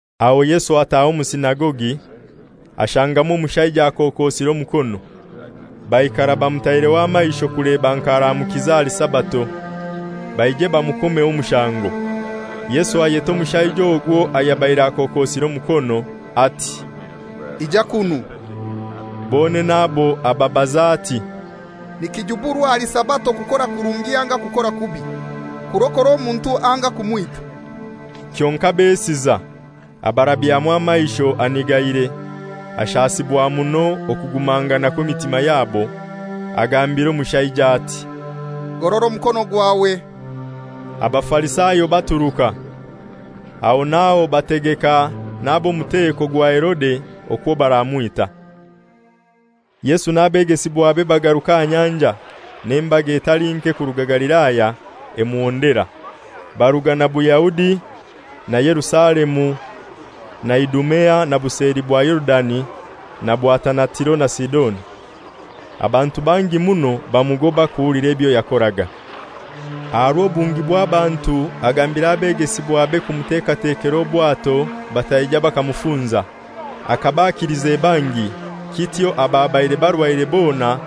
Aho Yesu ataha omu sinagogi, ashangamu omushaija akokosire omukono. Baikara bamutaireho amaisho kuleba nk'aramukiza ahali Sabato, baije bamukomeho omushango. Yesu ayeta omushaija ogwo ayabaire akokosire omukono ati, «Ija kunu.» Bonene abo ababaza ati, «Nikijuburwa ahali Sabato kukora kurungi anga kukora kubi, kurokora omuntu anga kumwita?» Kyonkai besiza. Abarabyamu amaisho anigaire, ashasibwa muno okugumangana kw'emitima yabo. Agambira omushaija ati, «Gorora omukono gwawe.» Abafarisayo baturuka, aho n'aho bategeka n'ab'omuteko gwa Herode okwo baramwita. Yesu n'abegesibwabe bagaruka aha nyanja, n'embaga etali nke kuruga Galilaya emuhondera; baruga na Buyahudi, na Yerusalemu na Idumea na buseli bwa Yorudani na bwatana Tiro na Sidoni: Abantu bangi muno bamugoba kuhulira ebyo yakoraga. Aha rw'obungi bw'abantu agambira abegesibwabe kumuteekatekera obwato bataija bakamufunza. Akaba akilize bangi, kityo ababaire barwaire bona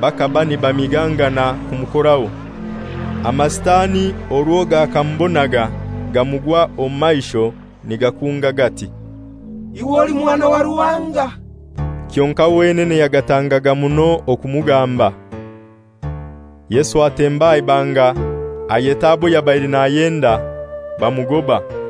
bakaba nibamigangana kumukoraho. AmaSitani orwo gakamubonaga gamugwa omu maisho nigakunga gati, «Iwe oli Mwana wa Ruhanga.» Kyonkai wenene yagatangaga muno okumugamba. Yesu atemba aha ibanga, ayeta abo yabaire nayenda; bamugoba.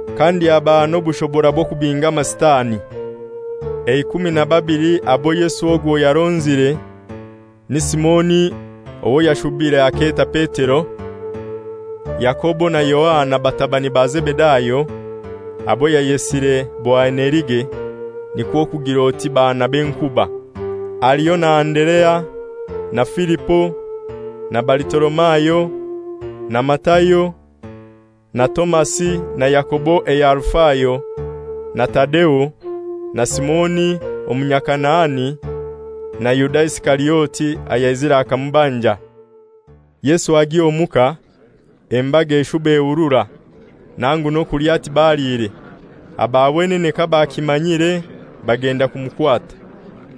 kandi abaha n'obushobora bw'okubinga Amasitani. Eikumi na babili abo Yesu ogwo yaronzire ni Simoni owo yashubire aketa Petero; Yakobo na Yohana batabani ba Zebedayo, abo yayesire Boanerige, nikwo kugir'oti baana b'enkuba. Haliho na Anderea, na Filipo, na Balitolomayo, na Matayo, na Tomasi na Yakobo eya Alufayo, na Tadeo, na Simoni Omunyakanaani, na Yuda Isikariote ayaizire akamubanja. Yesu agya omuka, embaga eshuba ehurura, nangu n'okulya tibaliire. Aba wenene kabakimanyire bagenda kumukwata,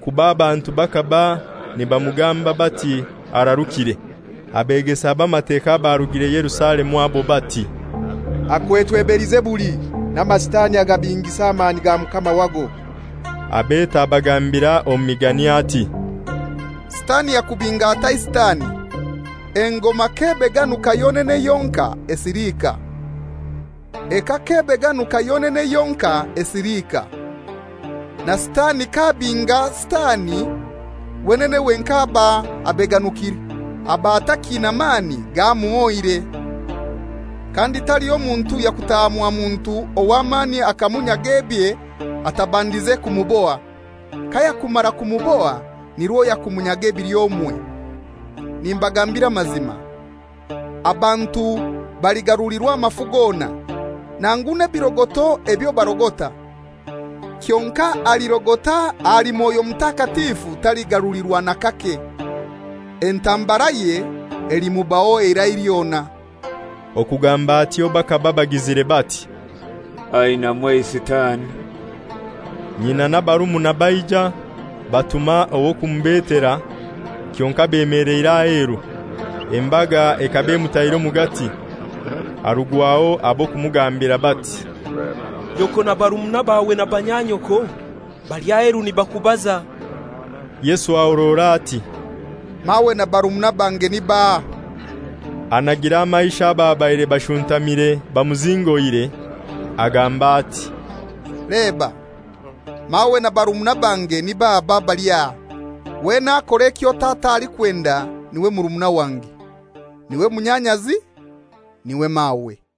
kuba abantu bakaba nibamugamba bati, «Ararukire.» Abegesa b'Amateka abarugire Yerusalemu abo bati, «Akwetwe Belizebuli, n'Amasitani agabingisa amani ga mukama wago.» Abeta abagambira omu migani ati, «Sitani yakubinga atai Sitani? Engoma k'ebeganuka yonene yonkai, esiliika. Eka k'ebeganuka yonene yonkai, esiliika. Na Sitani k'abinga Sitani, wenene wenkai aba abeganukire; aba atakiina mani, gamuhoire. Kandi taliho muntu yakutaha mwa muntu ow'amani akamunyaga ebye atabandize kumuboha. Kayakumara kumuboha nirwo yakumunyaga ebili omwe. «Nimbagambira amazima, abantu baligarulirwa amafu gona, nangu n'ebirogoto ebyo balirogota. Kyonkai alirogota ahali Mwoyo Mutakatifu taligarulirwa n'akake. Entambaraye elimubaho eirai lyona.» Okugamba atyo bakaba bagizire bati, «Ainamu eiSitani.» Nyina n'abarumuna baija, batuma ow'okumubetera, kyonkai bemeleire aheru. Embaga ekaba emutaire omugati; harugwaho ab'okumugambira bati, «Nyoko na barumuna bawe na banyanyoko bali aheru nibakubaza.» Yesu ahorora ati, «Mawe na barumuna bange ni baahai?» Anagira amaisho ababaire bashuntamire bamuzingoire, agamba ati, «Leba, mawe na barumuna bange nib'aba abali aha! Wena akora ekyo Tata alikwenda n'iwe murumuna wange, n'iwe munyanyazi, n'iwe mawe.»